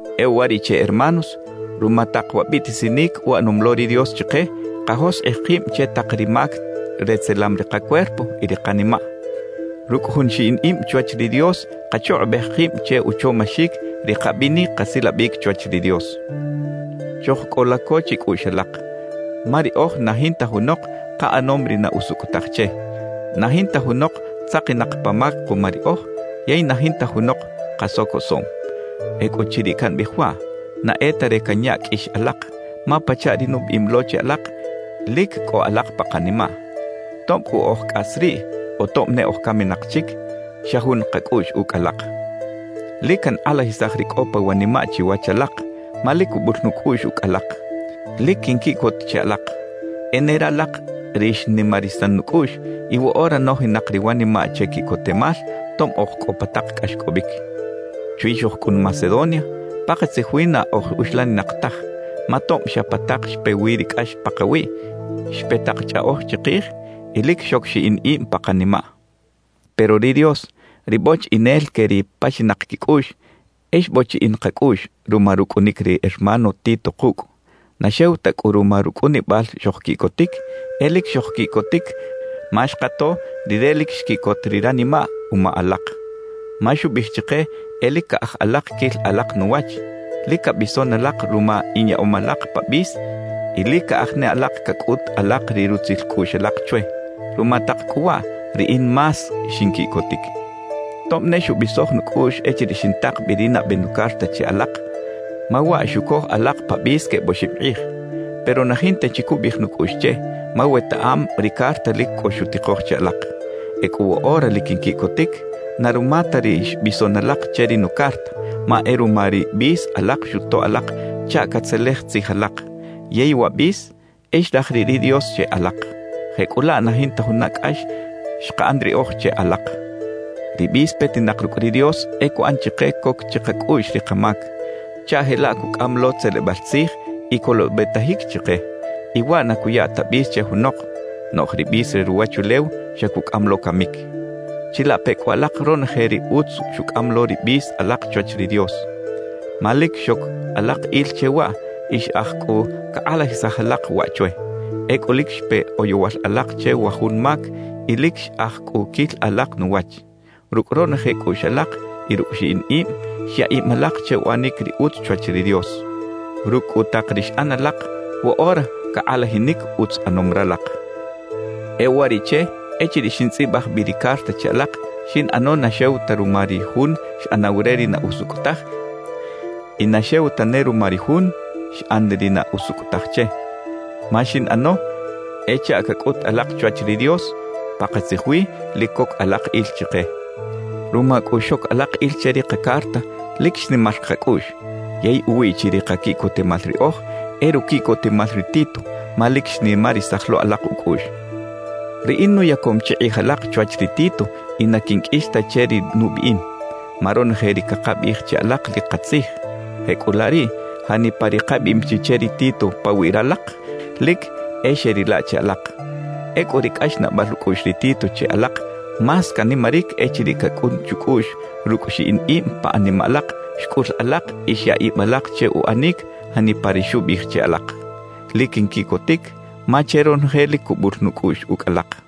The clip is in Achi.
E uwariꞌche, hermanos, ruma tak wa biꞌtisinic uꞌanom lo ri Dios chike, kajoskꞌij kib che tak ri mac retzelam ri kacuerpo y ri kanimaꞌ. Rucꞌ jun xiꞌin ib chwach ri Dios kachukꞌubej kib che uchomaxic ri kabinic kasilabic chwach ri Dios. Chojcꞌola co chicꞌuꞌx alak; ma riꞌoj na jinta junok kaꞌanom ri na usucꞌ taj che, na jinta junok tzakinak pa mac kuma riꞌoj yey na jinta junok kasocosoꞌm. Ecꞌuchiriꞌ cambiꞌij waꞌ, na e ta re canya qꞌuix alak; ma pachaꞌ ri nubiꞌim lo che alak, lic cꞌo alak pa kanimaꞌ. Tob cꞌu oj cꞌas riꞌ o tob ne oj caminak chic, xa jun kacꞌuꞌx ucꞌ alak. Lic cankꞌalajisaj ri cꞌo pa wanimaꞌ chiwach alak, ma lic cubul nucꞌuꞌx ucꞌ alak. Lic quinquiꞌcot che alak. E ne ralak ri xnimarisan nucꞌuꞌx y woꞌora nojinak ri wanimaꞌ che quiꞌcotemal tob oj cꞌo pa tak cꞌaxcꞌobic. Chwi xojcꞌun Macedonia, pakatzij wi na oj uxlaninak taj. Ma tob xa pa tak xpe wi ri cꞌax pakawiꞌ, xpe tak chꞌaꞌoj chikij y lic xoc xiꞌin ib pa kanimaꞌ. Pero ri Dios, ri bochiꞌinel que ri paxinak quicꞌuꞌx, e xbochiꞌin kacꞌuꞌx ruma rucꞌunic ri hermano Tito kucꞌ. Na xew ta cꞌu ruma rucꞌunibal xojquiꞌcotic; e lic xojquiꞌcotic ma xkato rire lic xquiꞌcot ri ranimaꞌ uma ralak. Ma xubiꞌij chike e lic caꞌaj alak quil alak nuwach, lic cabison alak ruma inyaꞌom alak pa bis y lic caꞌaj ne alak cacꞌut alak ri rutzil cꞌuꞌx alak chwe. Ruma tak cꞌu waꞌ, riꞌin más xinquiꞌcotic, tob ne xubisoj nucꞌuꞌx echiriꞌ xintak bi ri nabe nucarta che alak, ma waꞌ xucoj alak pa bis queb oxib kꞌij. Pero na jinta chi cubiꞌij nucꞌuꞌx che, ma wetaꞌam ri carta lic cꞌo xutikoj che alak. Ecꞌu woꞌora lic quinquiꞌcotic, na ruma ta ri xbison alak che ri nucarta, ma e ruma ri bis alak xutoꞌ alak chaꞌ catzelej tzij alak, yey wa bis e xraj riꞌ ri Dios che alak. Jecꞌulaꞌ na jinta juna cꞌax xkaꞌan riꞌoj che alak. Ri bis petinak rucꞌ ri Dios e cuꞌan chike coc chikacꞌuꞌx ri kamac, chaꞌ jelaꞌ cucꞌam lo tzelebal tzij y colobetajic chike y ¡waꞌ na cuya ta bis che junok! Noꞌj ri bis re ruwachulew xa cucꞌam lo camic. ¡Chilape cꞌu alak ronoje ri utz xucꞌam lo ri bis alak chwach ri Dios! Ma lic xoc alak il che waꞌ y xꞌaj cꞌu cakꞌalajisaj alak waꞌ chwe. Ecꞌu lic xpe oyowal alak che wa jun mac y lic xꞌaj cꞌu quil alak nuwach. Rucꞌ ronoje cꞌuꞌx alak y rucꞌ xiꞌin ib, xya ib alak che uꞌanic ri utz chwach ri Dios. Rucꞌ cꞌu tak ri xꞌan alak, woꞌora cakꞌalajinic utz ꞌanom ralak. E uwariꞌche, echiriꞌ xintzꞌibaj bi ri carta che alak, xinꞌano na xew ta ruma ri jun xꞌanaw re ri na usucꞌ taj y na xew tane ruma ri jun xꞌan ri na usucꞌ taj che, ma xinꞌano e chaꞌ cacꞌut alak chwach ri Dios: Pakatzij wi lic coc alak il chike. Ruma cꞌu xoc alak il che ri kacarta, lic xnimar kacꞌuꞌx. Yey uwiꞌ chi ri kaquiꞌcotemal riꞌoj, e ruquiꞌcotemal ri Tito, ma lic xnimarisaj lo alak ucꞌuꞌx. Riꞌin nuyacom chi kꞌij alak chwach ri Tito y na quinqꞌuix ta che ri nubiꞌim. Ma ronoje ri cakabiꞌij che alak lic katzij; jecꞌulaꞌ riꞌ, janipa ri kabiꞌim chi che ri Tito pawiꞌ ralak, lic e xeꞌrila che alak. Ecꞌu ri cꞌaxnaꞌbal ucꞌuꞌx ri Tito che alak más canimaric echiriꞌ cacꞌun chucꞌuꞌx rucꞌ xiꞌin ib pa animaꞌ alak xcꞌul alak y xya ib alak che uꞌanic janipa ri xubiꞌij che alak. Lic quinquiꞌcotic ma che ronoje lic cubul nucꞌuꞌx ucꞌ alak.